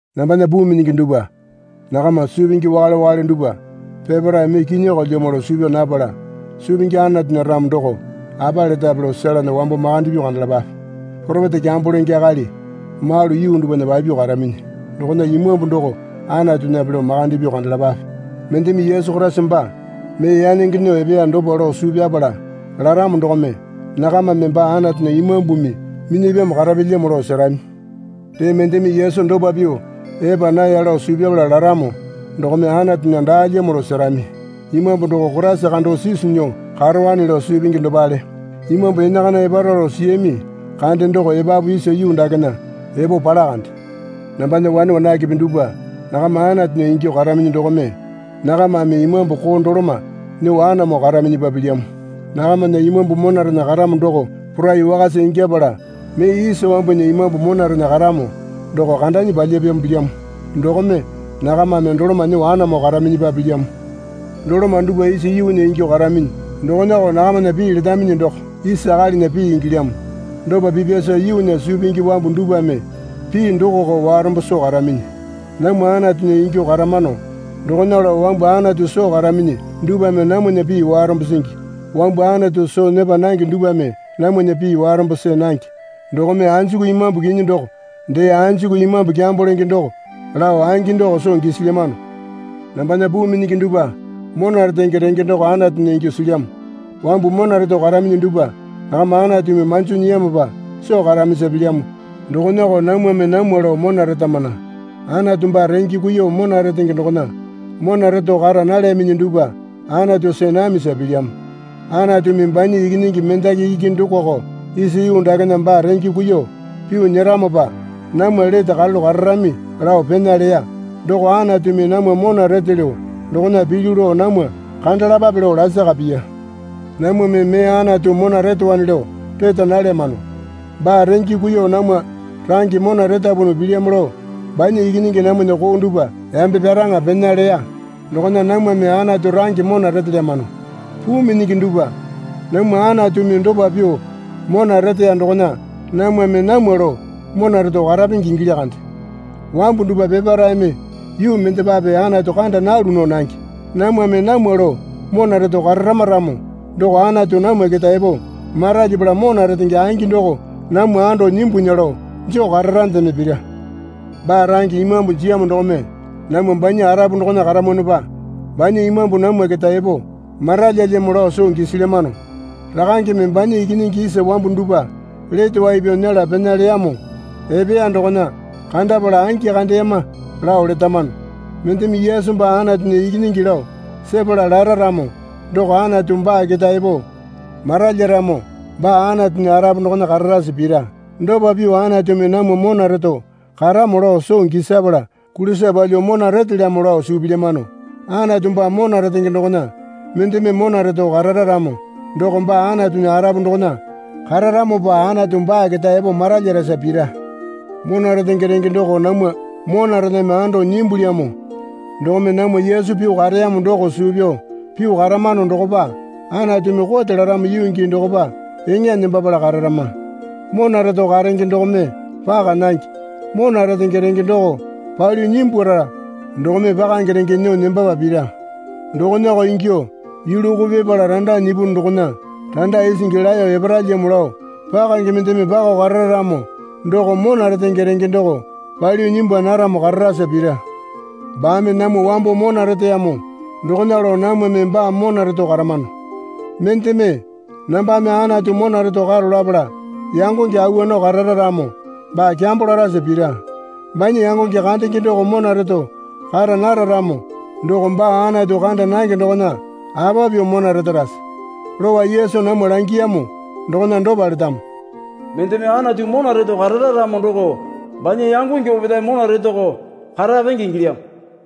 Nambana puu minyingi dupwa nakama suu pingi wakale wakale dupwa peparae mee kinyokolyamo lao suu pyaa napala suu pingi Anatunya ramo doko apa letape lao selena wambo makande pyuo kandalapape. Poropeta kyambo lenge akali malu yuu dupwana papyuo karaminyi dokona imambu doko Anatunyape lao makande pyuo kandalapape. Mendeme Yesu Koraisa baa mee yanenge nyuo epeya dopa lao suu pyapala laramo dokome nakamame baa Anatunya Imambumi minyapyamo karapyalyamo lao serami. Dee mendeme Yesu dopa pyuo epa naya lao suu pyapala laramo dokome Anatunya daalyamo lao serami. Imambu doko Koraisa kando sisu nyuo karowane lao suu pingi dopale. Imambu enakana epara lao siyami kande doko epapu isa yuu dakena epo pala kande. Nambana wane wanakepe dupwa nakama Anatunya ingyuo karaminyi dokome nakamame imambu koo doloma nyuo anamo karaminyipa pilyamo. Nakamana imambu monarena karamo doko porai wakasa ingyapala mee isa wambunya imambu monarena karamo doko kandanyi palyapyamo pilyamo dokome nakamame doloma nyuo anamo karaminyipa pilyamo. Doloma dupwa isa yuunya ingyuo karaminyi dokonako nakamana pii letaminyi doko isa akalinya pii ingilyamo. Dopa pipyasa yuunya suu pingi wambu dupwame pii dokoko warombo soo karaminyi. Namwa Anatunya ingyuo karamano. Dokona lao wambu Anatu soo karaminyi dupwame namwana pii warombo singi. Wambu Anatu soo nyepa nange dupwame namwana pii warombo see nange. Dokome anjuku imambu kinyi doko dee anjuku imambu kyambo lenge doko lao angi doko soo gisilyamano. Nambana puu minyingi dupwa mona retenge renge doko Anatunya ingyuo silyamo. Wambu mona reto karaminyi dupwa nakama Anatumi manjo nyiyamopa soo karamisa pilyamo dokonako namwame namwa lao mona retamana. Anatu baa renge kuiyuo mona retenge dokona mona reto kara nalyaminyi dupwa Anatu see namisa pilyamo. Anatumi banya Ikinyingi mendaki iki dokoko isa yuu dakena baa renge kuiyuo pyuo nyeramopa namwa lete karalu kararami lao pena leya doko Anatumi namwa mona retelyo dokona pilyu lao namwa kandalapape lao lasaka piya. Namwame mee Anatu mona retowane lao reta nalyamano. Baa renge kuiyuo namwa range mona retapunu pilyamo lao banya Ikinyingi namwana koo dupwa yambe pyaraŋa pena leya dokona namwame Anatu range mona retelyamano. Puu minyingi dupwa namwa Anatumi dopa pyuo mona reteya dokona namwame namwa lao mona reto karapenge ingilya kande. Wambu dupwa peparaeme yuu mendepape Anatu kanda nalu nao nange. Namwame namwa lao mona reto kararama ramo doko Anatu namwa keta epo maralyapala mona retenge angi doko namwa ando nyimbunya lao joo kararandeme pira. Baa range Imambu jiyamo dokome namwa banya arapu dokona karamwanopa banya Imambu namwa keta epo maralyalyamo lao soo gisilyamano. Rakangeme banya Ikinyingi isa wambu dupwa lete wai pyao nyela pena leyamo epeya dokona kandapala angi kandeyama lao letamano. Mendeme Yesu baa Anatunya Ikinyingi lao sepala lara ramo doko Anatu baa keta epo maralyaramo baa Anatunya arapu dokona kararasa pira. Dopa pyuo Anatumi namwa mona reto karamo lao soo gisapala kulisa palyuo mona retelyamo lao suu pilyamano. Anatu baa mona retenge dokona mendeme mona reto karara ramo doko baa Anatunya arapu dokona kararamopa Anatu baa keta epo maralyarasa pira. Mona retenge renge doko namwa monarename ando nyimbulyamo dokome namwa Yesu pyuo kareyamo doko suu pyao pyuo karamano dokopa Anatumi kote laramo yuu gii dokopa eŋa nembapala kararama. Mona reto karenge dokome paka nange. Mona retenge renge doko palyuo nyimbwara dokome pakange renge nyuo nembapa pira. Dokonako ingyuo yulu koo pipala randa nyipu dokona randa isingi laeyo eparalyamo lao pakange mendeme pakao karara ramo doko mona retenge renge doko palyuo nyimbwa naramo kararasa pira. Baame namwa wambo mona reteyamo dokona lao namwame baa mona reto karamano. Mendeme, nambame Anatu mona reto karo lapala yangonge awa nao karara ramo baa kyambo larasa pira. Banya yangonge kandenge doko mona reto kara nara ramo doko baa Anatu kanda nange dokona apa pyuo mona retarase? Lowa Yesu namwa langiyamo dokona dopa letamo. Mendeme Anatu mona reto karara ramo doko banya yangonge opetae mona retoko karapenge ingilyamo.